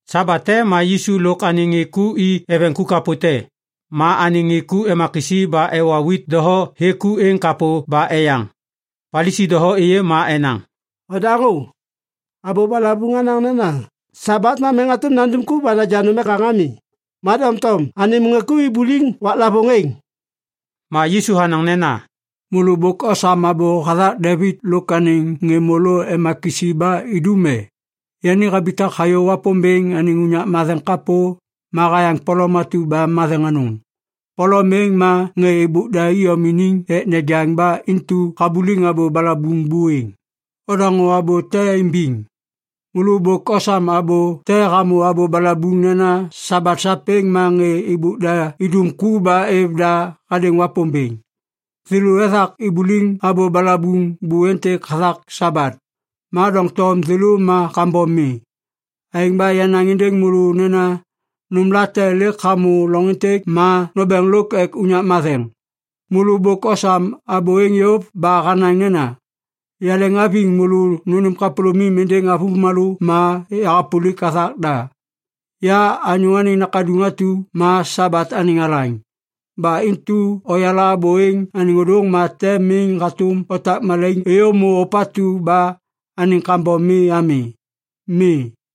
Sabat te ma Yisu lôk anêŋ ŋê ku i eveŋ ku kapô te. Ma anêŋ ŋê ku ema kisi ba ewa wit doho hêk ku êŋ kapô ba eyaŋ. Palisi doho êyê ma enaŋ, “Ondaŋô! Abô balabuŋ hanaŋ nena Sabat ma miŋ hatôm nandum ku ba naja nôm ek naŋgaŋ ami. Ma doŋtom anêm ŋê ku ibuliŋ waklavôŋ êŋ!” Ma Yisu hanaŋ nena, “Môlô bôk osam abô hathak Devit lôk anêŋ ŋê môlô ema kisi ba idum e? Yani habitak hayô Wapômbêŋ anêŋ unyak matheŋ kapô ma hayaŋ polom atu ba matheŋ anôŋ. Polom êŋ ma ŋê êbôk da iyom iniŋ ek nejaŋ ba intu habuliŋ abô balabuŋ buêŋ. Odaŋô abô te imbiŋ. Môlô bôk osam abô te hamô abô balabuŋ nena Sabat sapêŋ ma ŋê êbôk da idum ku ba êv da hadêŋ Wapômbêŋ. Thêlô ethak ibuliŋ abô balabuŋ bô êntêk hathak Sabat. Ma doŋtom thêlô ma kambom mi. Aêŋ ba yanaŋ êndêŋ môlô nena nômlate lêk hamô loŋ êntêk ma nômbêŋ lôk ek unyak matheŋ. Môlô bôk osam abô êŋ yôv ba hanaŋ nena, “‘Yaleŋhaviŋ môlô nônêm kapôlômim êndêŋ avômalô ma yahapôlik hathak da.’ “Ya Anyô Anêŋ Nakaduŋ atu ma Sabat anêŋ Alaŋ. Ba intu oyala abô êŋ anêŋ ôdôŋ, ma tem miŋ hatôm notak malaiŋ êyômô ôpatu ba anêŋ kambom mi ami. Mi.”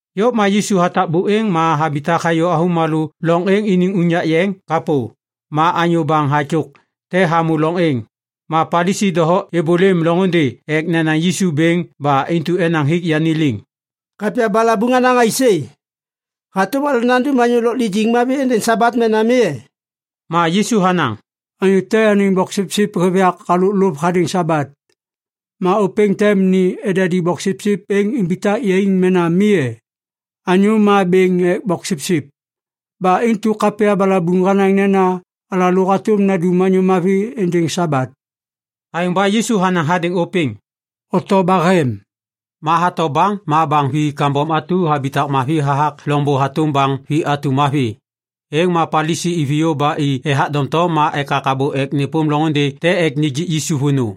Yôv ma Yisu hatak buêŋ ma habitak hayô avômalô loŋ êŋ iniŋ unyak yeŋ kapô. Ma anyô baŋ hatyôk te hamô loŋ êŋ. Ma Palisi doho êbôlêm loŋôndê ek nenaŋ Yisu bêŋ ba intu enaŋ hik yani liŋ, “Kapya balabuŋ hanaŋ aisê? Hatôm alalô nandum anyô lôk lijiŋ mavi êndêŋ Sabat mena mi e?” Ma Yisu hanaŋ, “Anyô te anêŋ boksipsip hêv yak halôk lôv hadêŋ Sabat, ma ôpêŋ tem ni edadi boksipsip êŋ imbitak yaiŋ mena mi e? Anyô ma bêŋ ek boksipsip. Ba intu kapya balabuŋ hanaŋ nena alalô hatôm nandum anyô mavi êndêŋ Sabat.” Aêŋ ba Yisu hanaŋ hadêŋ ôpêŋ, “Oto bahem.” Ma hato baŋ ma baŋ vi kambom atu habitak mavi hathak loŋbô hatôm baŋ vi atu mavi. Êŋ ma Palisi iviyô ba i ethak doŋtom ma ekak abô ek nêpôm loŋôndê te ek nijik Yisu vônô.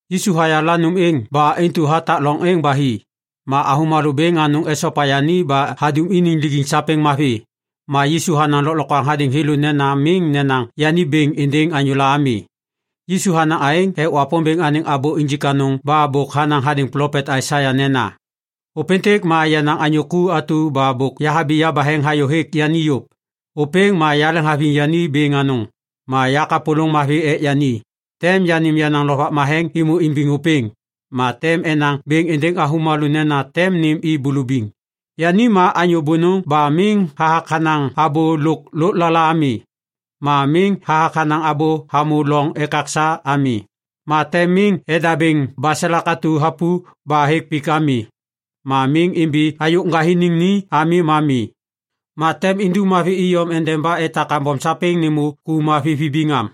Yisu hayala nôm êŋ ba intu hatak loŋ êŋ ba hi. Ma avômalô bêŋ anôŋ esopa yani ba hadum iniŋ lijiŋ sapêŋ mavi. Ma Yisu hanaŋ lôklokwaŋ hadêŋ thêlô nena miŋ nenaŋ yani bêŋ êndêŋ anyôla ami. Yisu hanaŋ aêŋ ek Wapômbêŋ anêŋ abô injik anôŋ ba bôk hanaŋ hadêŋ plopet Aisaia nena, “Ôpêntêk ma yenaŋ anyô ku atu ba bôk yahabi yabaheŋ hayô hêk yani yôv. Ôpêŋ ma yaleŋhaviŋ yani bêŋ anôŋ, ma yakapôlôŋ mavi ek yani; tem yanêm yenaŋ Lovak Matheŋ êmô imbiŋ ôpêŋ, ma tem enaŋ bêŋ êndêŋ avômalô nena tem nêm i bulubiŋ. Yani ma anyô bônôŋ ba miŋ hathak hanaŋ abô lôk lôklala ami, ma miŋ hathak hanaŋ abô hamô loŋ ekaksa ami. Ma tem miŋ edabêŋ baselak atu hapu ba hêk pik ami, ma miŋ imbi ayôk ŋgathiniŋ ni ami ma mi. Ma tem indum mavi iyom endeba etak kambom sapêŋ nêmô ku mavi vibiŋ am.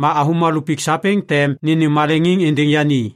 Ma avômalô pik sapêŋ tem nênêm maleŋiŋ êndêŋ yani.”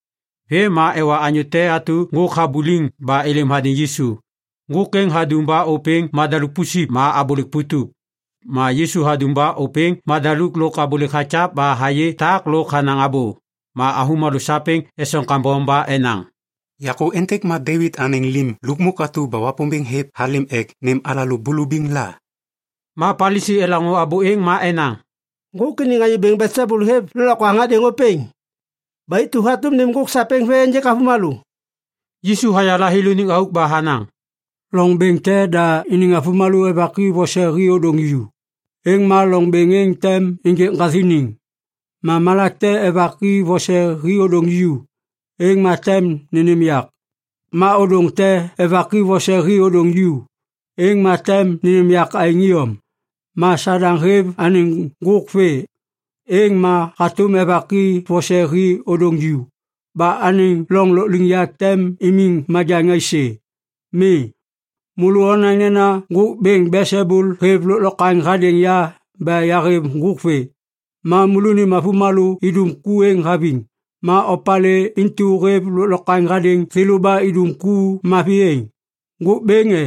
Vêm ma ewa anyô te atu ŋgôk habuliŋ ba êlêm hadêŋ Yisu. Ŋgôk êŋ hadum ba ôpêŋ madaluk pusip ma abôlêk putup. Ma Yisu hadum ba ôpêŋ madaluk lôk abôlêk hakyav ba hayê tak lôk hanaŋ abô. Ma avômalô sapêŋ esoŋ kambom ba enaŋ, “Yakô êntêk ma Devit anêŋ Lim Lukmuk atu ba Wapômbêŋ hêv halêm ek nêm alalô bulubiŋ la?” Ma Palisi elaŋô abô êŋ ma enaŋ, “Ŋgôk iniŋ anyô bêŋ Belsebul hêv lôklokwaŋ hadêŋ ôpêŋ. Ba intu hatôm nêm ŋgôk sapêŋ vê ênjêk avômalô.” Yisu hayala thêlôniŋ auk ba hanaŋ, “Loŋ bêŋ te da iniŋ avômalô evaki vose hi ôdôŋ ju, êŋ ma loŋ bêŋ êŋ tem ênjêk ŋgathiniŋ. Ma malak te evaki vose hi ôdôŋ ju, êŋ ma tem nênêm yak. Ma ôdôŋ te evaki vose hi ôdôŋ ju, êŋ ma tem nênêm yak aêŋ iyom. Ma Sadaŋ hêv anêŋ ŋgôk vê, êŋ ma hatôm evaki vose hi ôdôŋ ju. Ba anêŋ loŋ lôkliŋyak tem imiŋ majaŋ aisê? Mi. Môlô onaŋ nena ŋgôk bêŋ Belsebul hêv lôklokwaŋ hadêŋ ya ba yahêv ŋgôk vê. Ma môlônim avômalô idum ku êŋ haviŋ! Ma opalê intu hêv lôklokwaŋ hadêŋ thêlô ba idum ku mavi êŋ? Ŋgôk Bêŋ, e?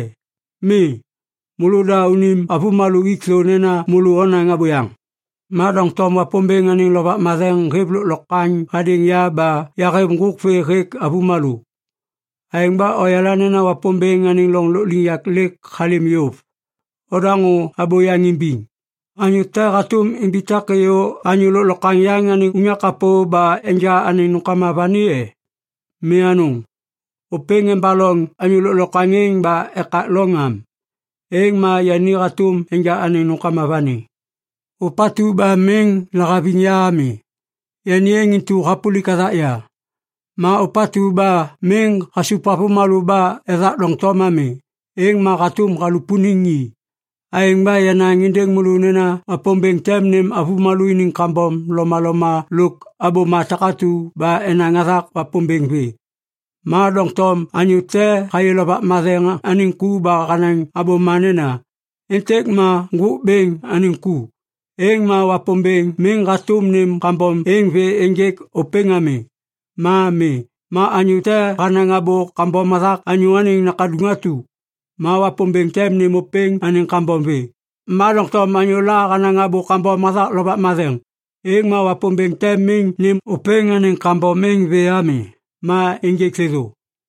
Mi! Môlôda unim avômalô ik thô nena môlô onaŋ abôyaŋ. Ma doŋtom Wapômbêŋ anêŋ Lovak Matheŋ hêv lôklokwaŋ hadêŋ ya ba yahêv ŋgôk vê hêk avômalô. Aêŋ ba oyala nena Wapômbêŋ anêŋ loŋ lôkliŋyak lêk halêm yôv. “Odaŋô abô yaŋ imbiŋ. Anyô te hatôm imbitak êyô anyô lôklokwaŋ yaŋ anêŋ unyak kapô ba enja anêŋ nômkama vani e? Mi anôŋ! Ôpêŋ embaloŋ anyô lôklokwaŋ êŋ ba ekak loŋ am, êŋ ma yani hatôm enja anêŋ nômkama vani. “Ôpatu ba miŋ lahaviŋ ya ami, yani êŋ intu hapôlik hathak ya. Ma ôpatu ba miŋ hasup avômalô ba ethak doŋtom ami, êŋ ma hatôm halupuniŋ i. “Aêŋ ba yanaŋ êndêŋ môlô nena Wapômbêŋ tem nêm avômalô iniŋ kambom lomaloma lôk abôma takatu ba enaŋ hathak Wapômbêŋ vê. Ma doŋtom anyô te hayê Lovak Matheŋ anêŋ ku ba hanaŋ abôma nena, ‘Êntêk ma Ŋgôk Bêŋ anêŋ ku’, êŋ ma Wapômbêŋ miŋ hatôm nêm kambom êŋ vê ênjêk ôpêŋ ami. Ma mi. Ma anyô te hanaŋ abô kambom hathak Anyô Anêŋ Nakaduŋ atu, ma Wapômbêŋ tem nêm ôpêŋ anêŋ kambom vê. Ma doŋtom anyôla hanaŋ abô kambom hathak Lovak Matheŋ, êŋ ma Wapômbêŋ tem miŋ nêm ôpêŋ anêŋ kambom êŋ vê ami ma ênjêk thêthô.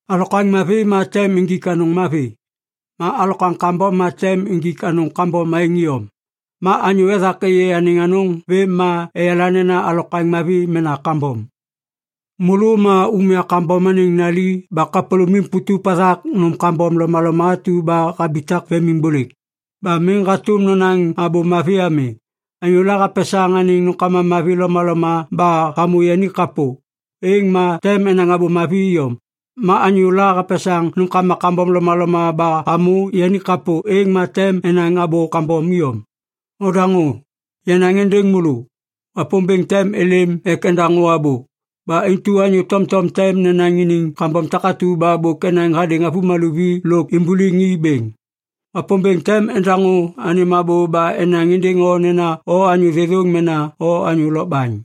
“Alokwaŋ mavi ma tem injik anôŋ mavi, ma alokwaŋ kambom ma tem injik anôŋ kambom aêŋ iyom. Ma anyô ethak êyê anêŋ anôŋ vêm ma eyala nena alokwaŋ mavi mena kambom. Môlô ma umya kambom anêŋ nali ba kapôlômim putup hathak nôm kambom lomaloma atu ba habitak vemimbôlêk. Ba miŋ hatôm nonaŋ abô mavi ami! Anyôla hapesaŋ anêŋ nômkama mavi lomaloma ba hamô yani kapô, êŋ ma tem enaŋ abô mavi iyom. Ma anyôla hapesaŋ nômkama kambom lomaloma ba hamô yani kapô, êŋ ma tem enaŋ abô kambom iyom. “Odaŋô! Yanaŋ êndêŋ môlô! Wapômbêŋ tem êlêm ek endaŋô abô. Ba intu anyô tomtom tem nenaŋ iniŋ kambom takatu ba bôk enaŋ hadêŋ avômalô vi lôk ibuliŋ i bêŋ. Wapômbêŋ tem endaŋô anêm abô ba enaŋ êndêŋ o nena o anyô thêthôŋ mena o anyô lokbaŋ.”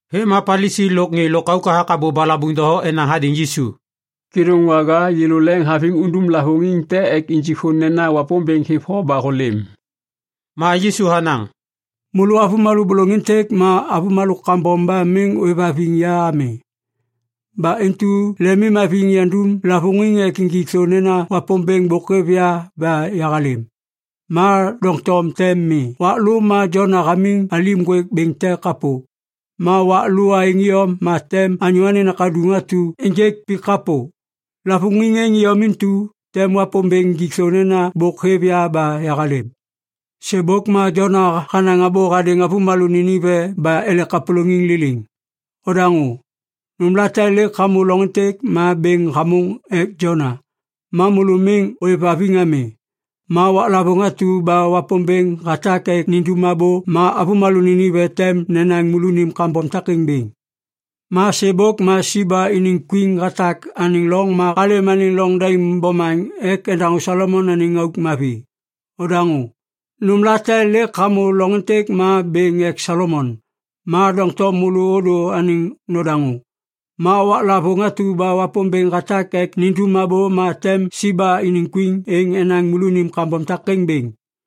Vêm ma Palisi lôk ŋê lôkauk hathak abô balabuŋ doho enaŋ hadêŋ Yisu, “Kêdôŋwaga, yêlô leŋiŋhaviŋ undum lavôŋiŋ te ek injik thô nena Wapômbêŋ hêv o ba hôlêm.” Ma Yisu hanaŋ, “Môlô avômalô bôlôŋ êntêk ma avômalô kambom ba miŋ ôêvhaviŋ ya ami. Ba intu lemimhaviŋ yandum lavôŋiŋ ek injik thô nena Wapômbêŋ bôk hêv ya ba yahalêm, ma doŋtom tem mi. Wak lô ma Jona hamiŋ alim ŋgwêk bêŋ te kapô. Ma wak lô aêŋ iyom ma tem Anyô Anêŋ Nakaduŋ atu ênjêk pik kapô. Lavôŋiŋ êŋ iyom intu tem Wapômbêŋ injik thô nena bôk hêv ya ba yahalêm. Sêbôk ma Jona hanaŋ abô hadêŋ avômalô Ninive ba ele kapôlôŋiŋ liliŋ. Odaŋô! Nômlate lêk hamô loŋ êntêk ma bêŋ hamôŋ ek Jona. Ma môlô miŋ ôêvhaviŋ ami. Ma waklavôŋ atu ba Wapômbêŋ hatak ek nindum abô ma avômalô Ninive tem nenaŋ môlônim kambom takêŋ bêŋ. Ma sêbôk ma Siba iniŋ kwin hatak anêŋ loŋ ma halêm anêŋ loŋ daim bomaŋ ek endaŋô Solomon anêŋ auk mavi. Odaŋô! Nômlate lêk hamô loŋ êntêk ma bêŋ ek Solomon. Ma doŋtom môlô ôdô anêŋ nodaŋô. Ma waklavôŋ atu ba Wapômbêŋ hatak ek nindum abô ma tem Siba iniŋ kwin êŋ enaŋ môlônim kambom takêŋ bêŋ.”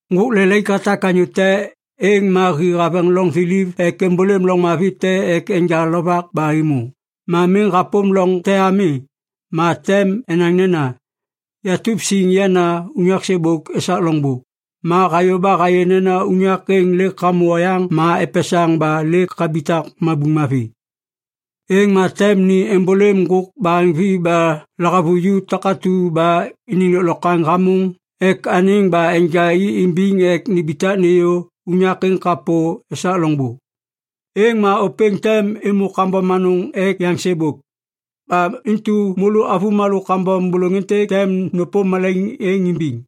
“Ŋgôk lelaik hatak anyô te, êŋ ma hi haveŋ loŋ thiliv ek êmbôlêm loŋ mavi te ek enja lovak ba êmô. Ma miŋ hapôm loŋ te ami, ma tem enaŋ nena, ‘Yatup siŋ yana unyak sêbôk esak loŋbô.’ Ma hayô ba hayê nena unyak êŋ lêk hamô oyaŋ ma epesaŋ ba lêk habitak mabuŋ mavi. Êŋ ma tem ni êmbôlêm ŋgôk baheŋvi ba lahavuju takatu ba iniŋ lôklokwaŋ hamôŋ ek anêŋ ba enja i imbiŋ ek nimbitak nêyô unyak êŋ kapô esak loŋbô. Êŋ ma ôpêŋ tem êmô kambom anôŋ ek yaŋ sêbôk. Ba intu môlô avômalô kambom bôlôŋ êntêk tem nôpôm malaiŋ êŋ imbiŋ.”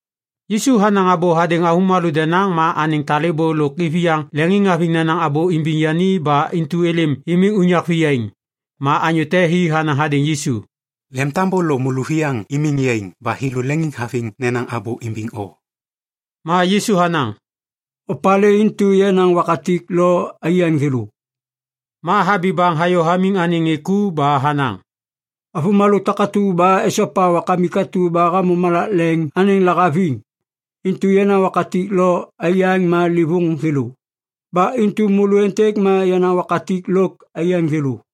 Yisu hanaŋ abô hadêŋ avômalô denaŋ ma anêŋ talêbô lôk iviyaŋ leŋiŋhaviŋ nenaŋ abô imbiŋ yani ba intu êlêm imiŋ unyak viyaiŋ. Ma anyô te hi hanaŋ hadêŋ Yisu, “Lemtambô lôk môlôviyaŋ imiŋ yaiŋ ba thêlô leŋiŋhaviŋ nenaŋ abô imbiŋ o.” Ma Yisu hanaŋ, “Opalê intu yenaŋ wakatik lôk aiyaŋ thêlô?” Ma habi baŋ hayô hamiŋ anêŋ ŋê ku ba hanaŋ, “Avômalô takatu ba esopa Wakamik atu ba hamô malak leŋ anêŋ lahaviŋ, intu yenaŋ wakatik lôk aiyaŋ ma livôŋ thêlô. Ba intu môlô êntêk ma yenaŋ wakatik lôk aiyaŋ thêlô.”